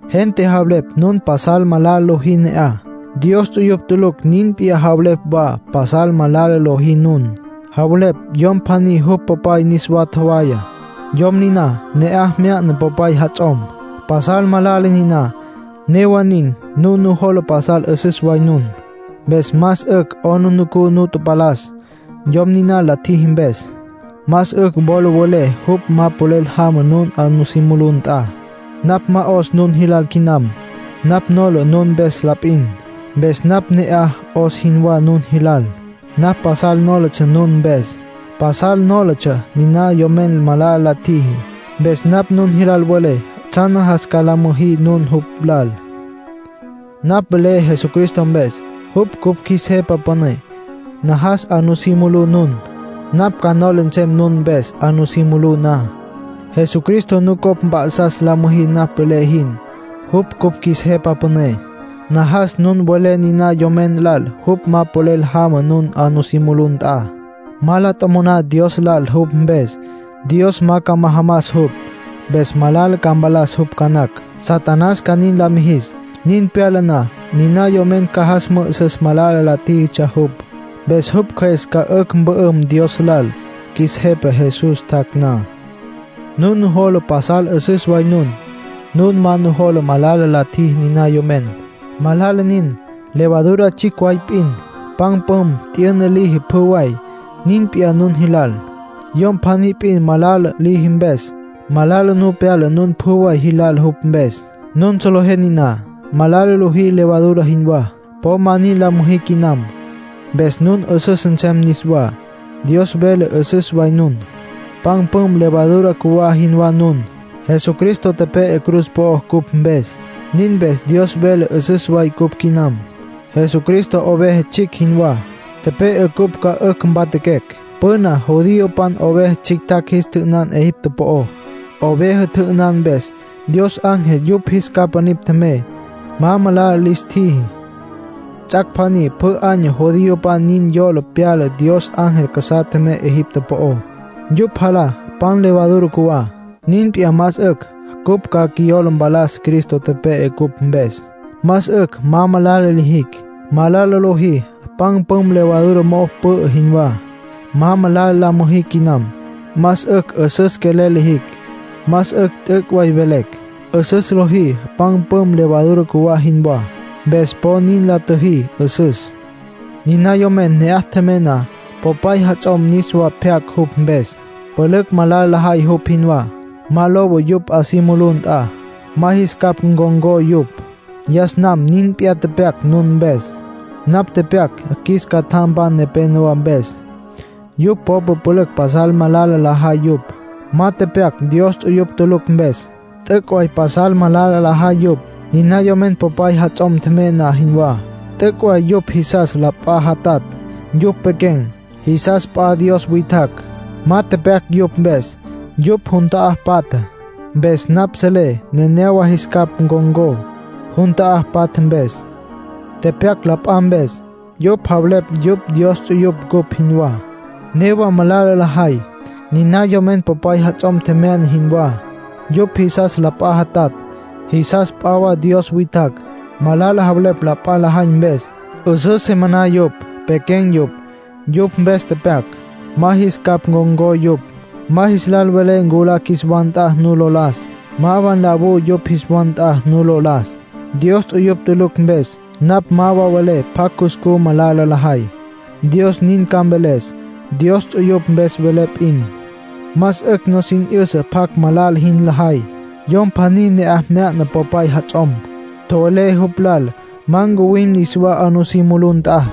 Gente javelepj nun pasal malala lojí ne'aj. Dios ts'uyupj tulucj nin p'iyá javelepj wa pasal malala lojí nun. Javelepj yom pjaní jupj popay niswa tjowaya. Yom niná, ne'aj mya'na popay jats'om. Pasal malala niná. Newa nin, nun nujola pasal 'üsüs way nun. Más 'ücj 'aplijila nu tapalas, yom niná la tjiji mpes. Más 'ücj wola welé jupj ma polel jama nun 'a nusí mulú nt'a. Napj ma 'os nun jilal quinam; napj nola nun mpes la p'in, mpes napj ne'aj 'os jinwá nun jilal. Napj pasal nólatsja nun mpes. Pasal nólatsja niná yomen malala la tjiji. Mpes napj nun jis lal mvelé tsjan najas ca la müjí nun jupj lal. Napj velé Jesucristo mpes, jupj cupj qjuis Jepa Püné. Najas 'a nusí mulú nun. Napj ca nola nsem nun mpes 'a nusí mulú na. Jesucristo nucopj mp'a'sas la müjí napj velé jin, jupj cupj qjuis Jepa Püné. Najas nun welé niná yomen lal jupj ma polel jama nun 'a nusí mulú nt'a. Ma la tjomoná Dios lal jupj mpes, Dios ma ca majamas jupj. Mpes malala ca mpalas jupj ca nacj, Satanás ca nin la mijis. Nin pyala na, niná yomen ca jas mü'üsüs malala la tjíjitsja jupj. Mpes jupj cjües ca 'ücj mpü'üm Dios lal, qjuis Jepa Jesús tjac' na. Nun nujola pasal 'üsüs way nun. Nun ma nujola malala la tjiji niná yomen. Malala nin. Levadura tsjicj way p'in, pan püm t'yüna liji pjü way. Nin p'iyá nun jilal. Yom pjaní p'in malala liji mpes, malala nu pyala nun pjü way jilal jupj mpes. Nun solejé niná. Malala lojí levadura jinwá. Po ma nin la müjí quinam. Mpes nun 'üsüs nsem niswá. Dios vele 'üsüs way nun. Pan püm levadura cjuwá jinwá nun. Jesucristo tepe'e cruz po'ó cupj mpes; nin mpes Dios vele 'üsüs way cupj quinam. Jesucristo oveja tsjicj jinwá, tepe'e cupj ca 'ücj mpatjaquecj. Püna judiopan oveja tsjictjacj jis tjü'ünan Egipto po'ó. (Oveja tjü'ünan mpes, Dios ángel yupj jis capa nipj tjemey, ma malala lis tjiji.) Ts'ac' pjaní pjü año judiopan nin yola pyala Dios ángel casa'a tjemey Egipto po'ó. Yupj jalá pan levadura cjuwá. Nin p'iyá más 'ücj cupj ca qjuiyola mpalas Cristo tepe'e cupj mpes. Más 'ücj ma malala lijicj. Malala lojí pan püm levadura mo'o pü'ü jinwá. Ma malala la müjí quinam. Más 'ücj 'üsüs quelel lijicj. Más 'ücj t'üc' way velecj. 'Üsüs lojí pan püm levadura cjuwá jinwá. Mpes po nin la tjüjí 'üsüs. Niná yomen ne'aj tjemya'na popay jats'om, niswa pyac jupj mpes. Pülücj malala lajay jupj jinwá. Ma lowa yupj 'a si mulú nt'a. Ma jis capj ncon̈có yupj. Yas nam nin p'iyá tepyac nun mpes. Napj tepyac qjuis catjampan nepénowa mpes. Yupj popa pülücj pasal malala lajay yupj. Ma tepyac Dios ts'uyupj tulucj mpes. T'üc' way pasal malala lajay yupj, niná yomen popay jats'om tjemya'na jinwá. T'üc' way yupj jisas la p'a jatatj. Yupj pequen̈. Jisas p'a wa dios witjacj. Ma tepyac yupj mpes. Yupj jun ta'á patja. Mpes napj selé nenéyawa jis capj con̈có, jun ta'á patja mpes. Tepyac la p'a mpes. Yupj javelepj yupj Dios ts'uyupj cupj jinwá. Newa malala lajay, niná yomen popay jats'om tjemya'na jinwá. Yupj jisas la p'a jatatj. Jisas p'a wa dios witjacj. Malala javelepj la p'a lajay mpes. 'Üsǘ se maná yupj. Pequen̈ yupj. Yupj mpes tepyac. Ma jis capj ncon̈có yupj. Ma jis lal welé nculá qjuis wa nt'a nu lo las. Ma wa nlawú yupj jis wa nt'a nu lo las. Dios ts'uyupj tulucj mpes, napj ma velé pjacj cuscú malala lajay. Dios nin ca mveles. Dios ts'uyupj mpes velé p'in, más 'ücj nusin 'yüsa pjacj malala jin lajay. Yom pjaní ne'aj mya'na popay jats'om. Tjowelé jupj lal ma ncuwim niswá 'a nusí mulú nt'a.